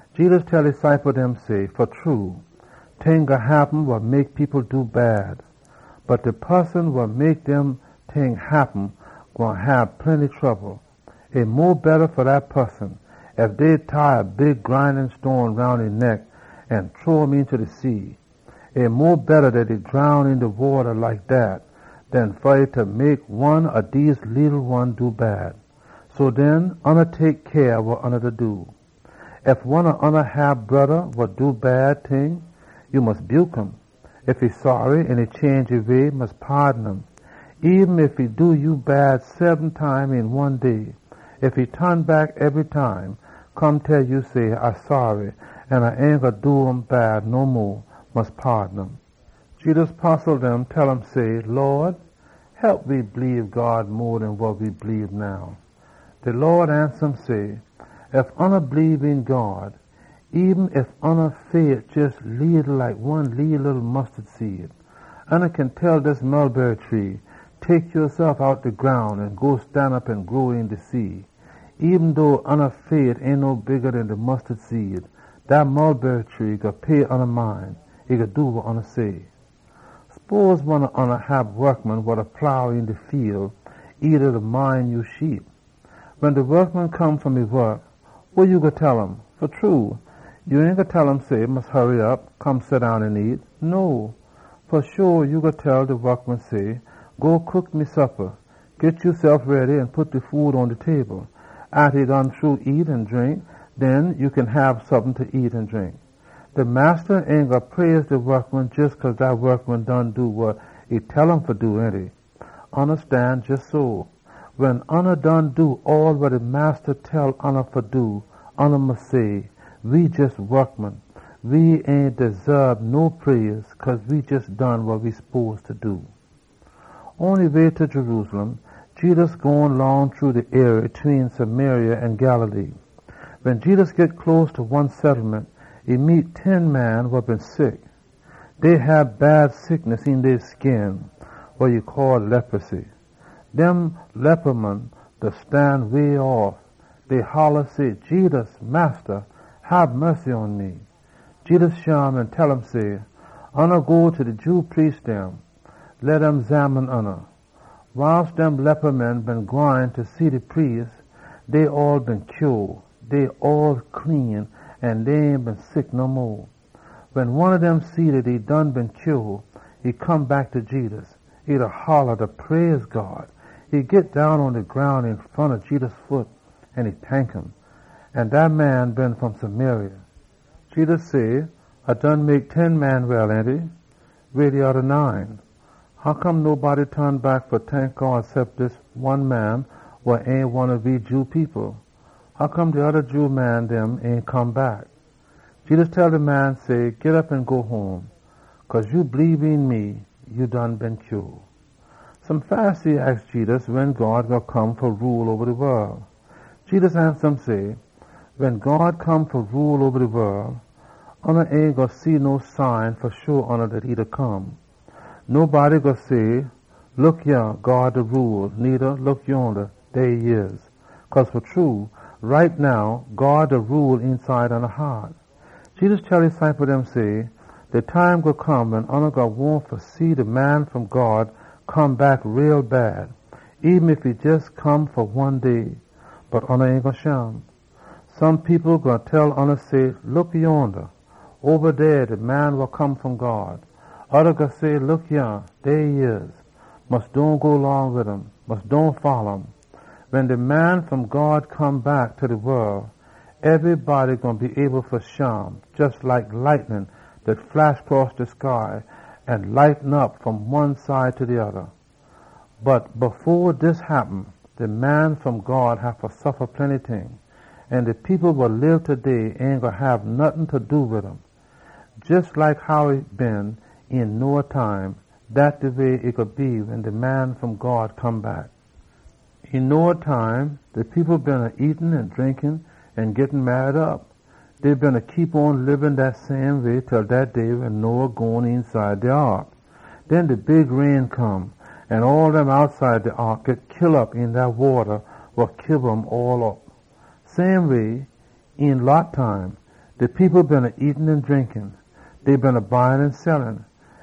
Jedus tell e ciple dem say, “Fa true, ting gwine happen wa mek people do bad. Bot de poson wa mek dem ting happen gwine hab plenty trouble! E mo betta fa dat poson ef dey tie a big grine stone roun e neck an chunk um eenta de sea. E mo betta ef e drown een de wata like dat den ef e mek one ob dem leetle one do bad. So den, tek cyah wa ya do! “Ef one ob oona hab a broda wa da sin, ya mus buke um. Ef e change e sinful way, mus paadon um. Eben ef e do ya bad seben time een one day, ef e ton back ebry time, come tell ya say, ‘A saary an A ain gwine do ya bad no mo,’ mus paadon um.” Jedus postle dem tell um say, “Lawd, hep we bleebe God mo den we bleebe now.” De Lawd ansa um say, “Ef oona bleebe een God, eben ef ya fait jes leetle like one leeleetle mustard seed, ya kin tell dis tree, ‘Tek yasef outta de groun an go stanop an grow een de sea!’ Eben dough ya fait ain no bigga den de mustard seed, dat mulberry tree gwine pay ya mind. E gwine do wa ya say.” “Sposin one ob oona hab wokman wa da plow een de fiel or e da mind ya sheep. Wen de wokman come fom e wok, wa ya gwine tell um? Fa true, ya ain gwine tell um say, ‘Mus hurry op. Come seddown an nyam.’ No! Fa sho ya gwine tell de wokman say, ‘Go cook me suppa. Git yasef ready an pit de food pon de table. Atta A done shru nyam an drink, den ya kin hab sompin fa nyam an drink.’ De massa ain gwine praise de wokman jes cause dat wokman done wa e tell um fa do, ainty? Oona stan jes so. Wen oona done do all wa de massa tell oona fa do, oona mus say, ‘We jes wokman. We ain desaab no praise, cause we jes done wa we spose fa do.’” Pon e way ta Jerusalem, Jedus gone long shru de arie tween Samaria an Galilee. Wen Jedus git close ta one settlement, e meet ten man wa been sick een dey skin wid leposy. Dem man beena stan faa way. Dey holla say, “Jedus! Massa! Hab mussy pon we!” Jedus shim an tell um say, “Oona go ta de Jew priest dem. Leh dem xamine oona.” Wiles dem man beena gwine fa see de priest, dey all been heal. Dey all clean an dey ain been sick no mo. Wen one ob dem see dat e done been heal, e come back ta Jedus. E holla, da praise God. E git down pon de groun een front ob Jedus foot an e tank um. An dat man been fom Samaria. Jedus say, “A done mek ten man clean, ainty? Weh de oda nine dem? Hoccome ain nobody ton back fa tank God cep dis one man wa ain one ob we Jew people? Hoccome de oda Jew man dem ain come back?” Jedus tell de man say, “Git op an go home. Cause ya bleebe een me, ya done git heal.” Some Pharisee aks Jedus wen God gwine come fa rule. Jedus ansa um say, “Wen God come fa rule, oona ain gwine see no sign fa sho dat. Ain nobody gwine say, ‘Look yah, dey e dey dey!’ Needa, ‘Look yonda!’ Cause God da rule mongst oona.” Jedus tell e ciple dem say, “De time gwine come wen oona gwine wahn bad fa see de Man wa Come fom God come back, eben ef e jes fa one day. Bot oona ain gwine shim. People gwine tell oona say, ‘Look yonda, oba dey de Man wa Come fom God!’ Oda gwine say, ‘Look yah, e dey dey!’ Mus dohn go long wid um. Mus dohn folla um. Wen de Man wa Come fom God come back ta de wol, ebrybody gwine be able fa shim, jes like lightnin dat flash cross de sky an light um op fom one side ta de oda. Bot fo dis happen, e haffa suffa plenty ting, an de people wa lib taday ain gwine hab nottin fa do wid um. Jes like how e been een Noah time, dat de way e gwine be wen de Man wa Come fom God gwine come back. Een Noah time, de people beena nyam an drink an git marry op. Dey beena lib dat same way til dat day wen Noah gone eenside de ark. Den de big rain come, an all dem outside de ark git kill op een dat wata wa kiba um all op. Same way, een Lot time, de people beena nyam an drink. Dey beena buy an sell.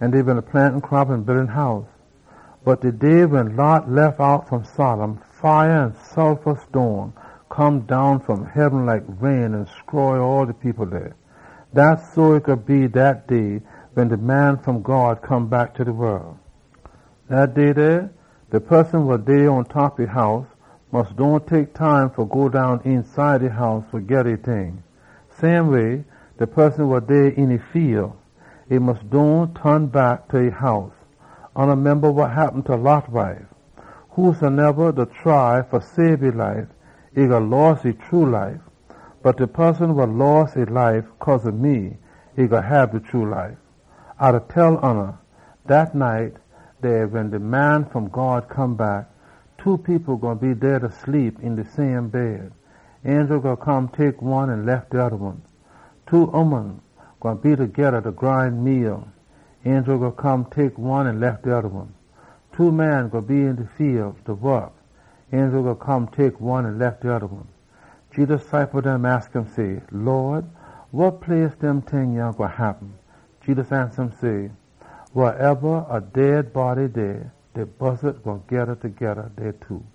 Dey beena plant crop an build house. Bot de day wen Lot lef out fom Sodom, fire an sulfa stone come down fom heaben like rain an stroy all de people dey. Dat so e gwine be dat day wen de Man wa Come fom God gwine come back ta de wol. “Dat day dey, de poson wa dey pontop e house mus dohn tek time fa go down eenside e house fa geda e ting. Same way, de poson wa dey een e fiel, e mus dohn ton back ta e house. Oona memba wa happen ta Lot wife! Whosoneba da try fa sabe e life, e gwine loss e true life. Bot de poson wa loss e life cause ob me, e gwine hab de true life. A da tell oona, dat night dey gwine be two people da sleep een de same bed. Angel gwine come tek one an lef de oda one. Two ooman gwine be togeda, da grine meal. Angel gwine come tek one an lef de oda one. [ Two man gwine be een de fiel, da wok. Angel gwine come tek one an lef de oda one.]” Jedus ciple dem aks um say, “Lawd, weh dem ting gwine happen?” Jedus ansa um say, “Wehsoneba dey a dead body, de buzzat dem gwine geda dey too.”